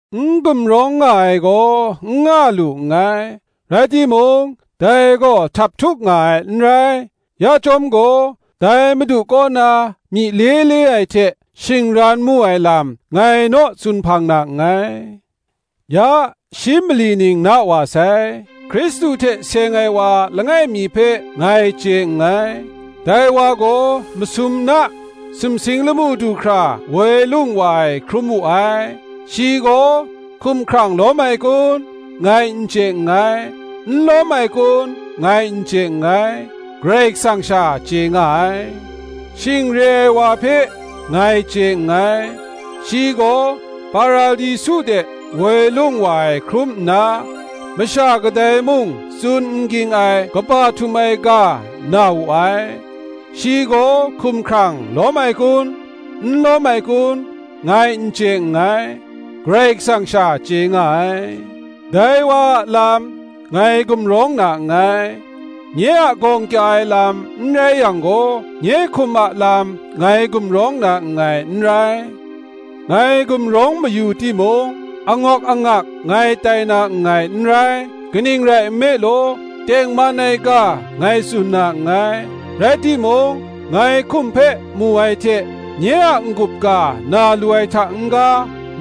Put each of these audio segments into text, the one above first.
N gumrawng nga ai gaw n nga lu nngai; rai timung dai gaw htaphtuk nga ai n rai: ya chyawm gaw, dai Madu kaw na myi le le ai hte shingran mu ai lam, ngai gaw tsun hpang na nngai. Ya shi mali ning na wa sai, Hkristu hte seng ai wa langai mi hpe ngai chye nngai; dai wa gaw masum na sumsing lamu du hkra woi lung wa ai hkrum wu ai: shi gaw hkumhkrang lawm ai kun, ngai n chye nngai, n lawm ai kun, ngai n chye nngai, Karai Kasang sha chye nga ai. Shing re ai wa hpe ngai chye nngai; shi gaw Paradisu de woi lung wa ai hkrum nna masha kadai mung tsun n ging ai kaba htum ai ga na wu ai: shi gaw hkumhkrang lawm ai kun, n lawm ai kun, ngai n chye nngai, Karai Kasang sha chye nga ai. Dai wa a lam ngai gumrawng na nngai: nye a gawng kya ai lam n rai yang gaw, nye hkum a lam ngai gumrawng na nngai n rai. Ngai gumrawng mayu timung, angawk angak ngai tai na nngai n rai; kaning rai nme law, tengman ai ga ngai tsun na nngai: rai timung, ngai hkum hpe mu ai hte nye a n-gup ga na lu ai hta n-ga,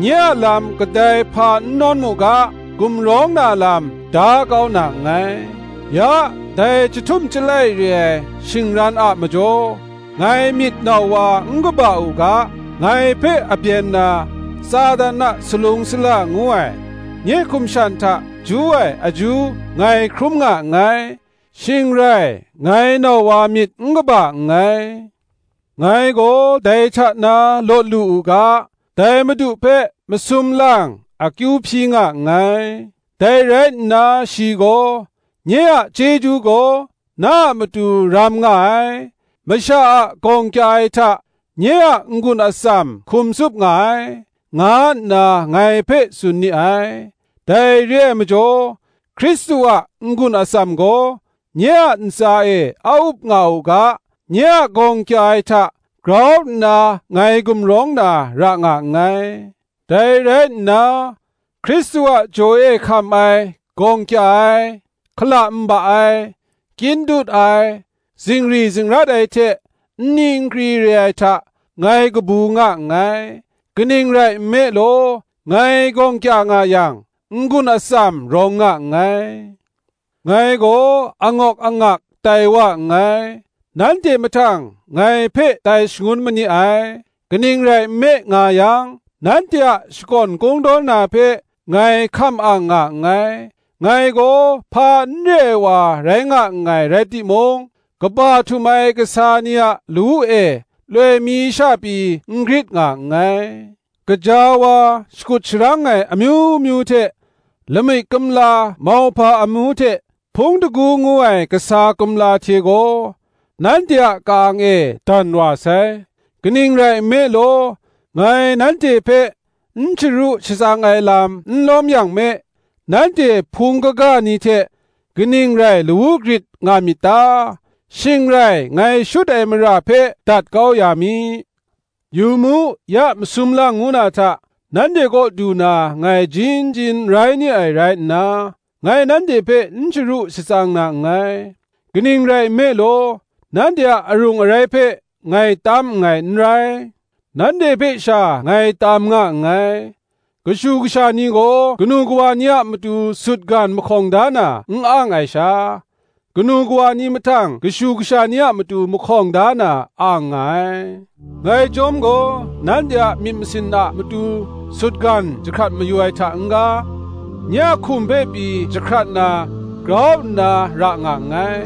nye a lam kadai mung hpa n nawn mu ga, gumrawng na lam da kau na nngai. Ya dai chyahtum chyalai re ai shingran a majaw, ngai myit nau wa n kaba u ga, ngai hpe abyen na Satan a salung sala ngu ai, nye hkum shan hta ju ai aju ngai hkrum nga nngai; shing rai ngai nau wa myit n kaba nngai. Ngai gaw dai hta na lawt lu u ga, dai Madu hpe masum lang akyu hpyi nga nngai. Dai rai nna shi gaw, “Nye a chyeju gaw na a matu ram nga ai; masha a gawng kya ai hta nye a n-gun atsam hkum tsup nga ai,” nga nna ngai hpe tsun ni ai. Dai re ai majaw, Hkristu a n-gun atsam gaw nye a ntsa e a up nga u ga, nye a gawng kya ai hta grau nna ngai gumrawng na ra nga nngai. Dai rai nna Hkristu a jaw e hkam ai gawng kya ai, hkala nba ai, kyin dut ai, zingri zingrat ai hte nni nkri re ai hta ngai kabu nga nngai: kaning rai nme law, ngai gawng kya nga yang, n-gun atsam rawng nga nngai. Ngai gaw angawk angak tai wa nngai; nanhte mahtang ngai hpe tai shangun ma ni ai: kaning rai nme nga yang, nanhte a shakawn kungdawn na hpe ngai hkam ang nga nngai. Ngai gaw hpa n re ai wa rai nga nngai rai timung, kaba htum ai kasa ni lawu e loi mi sha pyi n grit nga nngai. Gaja wa, shakut sharang ai amyu myu hte, lamik kumla mauhpa amu hte hpung shingkang ngu ai kasa kumla hte gaw, nanhte a ka-ang e dan wa sai. Kaning rai nme law, ngai nanhte hpe n sharu shatsang ai lam n lawm yang me, nanhte Hpung kaga ni hte kaning rai lawu grit nga myit ta? shing rai ngai shut ai mara hpe dat kau ya mi. Yu mu, ya masum lang ngu na hta nanhte kaw du na ngai jin jin rai ni ai rai nna, ngai nanhte hpe n sharu shatsang na nngai. Kaning rai nme law, nanhte a arung arai hpe ngai tam nngai n rai, nanhte hpe sha ngai tam nga nngai: kashu kasha ni gaw kanu kawa ni a matu sutgan mahkawng da na n ang ai sha, kanu kawa ni mahtang kashu kasha ni a matu mahkawng da na ang nga ai. Ngai chyawm gaw nanhte a myit masin a matu sutgan jahkrat mayu ai hta n-ga, nye a hkum hpe pyi jahkrat na grau nna ra nga nngai.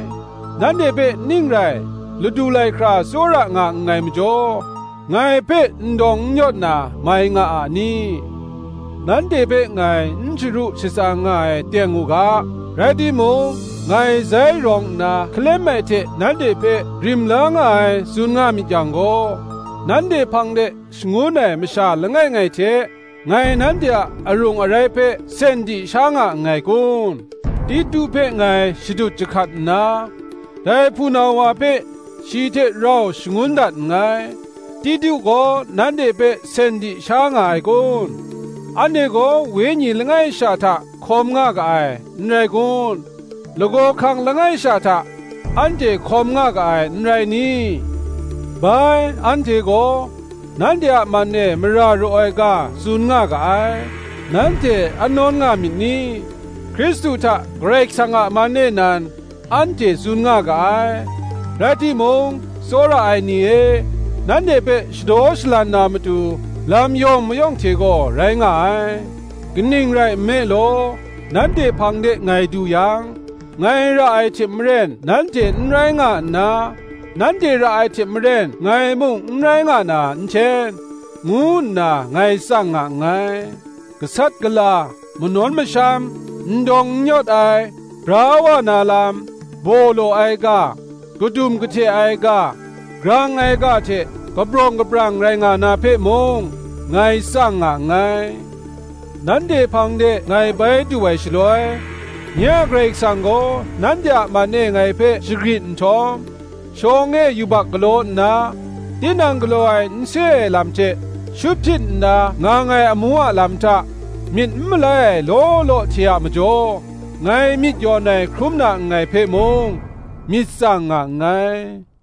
Nanhte hpe ning rai ladu lai hkra tsawra nga nngai majaw, ngai hpe n dawng n yawt na mai nga a ni? Nanhte hpe ngai n sharu shatsang nga ai teng u ga; rai timung, ngai zai rawng nna hkalem ai hte nanhte hpe rim la nga ai, tsun nga myit yang gaw, nanhte hpang de shangun ai masha langai ngai hte ngai nanhte a arung arai hpe sen di sha nga nngai kun? Titu hpe ngai shadut jahkat nna, dai hpunau wa hpe shi hte rau shangun dat nngai. Titu gaw nanhte hpe sen di sha nga ai kun? Anhte gaw Wenyi langai sha hta hkawm nga ga ai, n rai kun? Lagaw hkang langai sha hta anhte hkawm nga ga ai, n rai ni? Bai, anhte gaw nanhte a man e mara raw ai ga tsun nga ga ai, nanhte a nawn nga myit ni? Hkristu hta Karai Kasang a man e nan, anhte tsun nga ga ai. Rai timung, tsawra ai ni e, nanhte hpe shadaw shalan na matu, lam yawng mayawng hte gaw rai nga ai. Kaning rai nme law, nanhte hpang de ngai du yang, ngai ra ai hte maren nanhte n rai nga nna, nanhte ra ai hte maren ngai mung n rai nga na nhten, ngu nna ngai tsang nga nngai: gasat gala, manawn masham, n dawng n yawt ai, bra wa na lam, baw law ai ga, kadum kahte ai ga, grang ai ga hte kabrawng kabrang rai nga na hpe mung, ngai tsang nga nngai: nanhte hpang de ngai bai du ai shaloi, nye a Karai Kasang gaw nanhte a man e ngai hpe shagrit nhtawm, shawng e yubak galaw nna, tinang galaw ai n se ai lam hte, shut hpyit nna ngang ai amu a lam hta, myit n malai ai law law hte a majaw ngai myit yawn ai hkrum na nngai hpe mung, myit tsang nga nngai.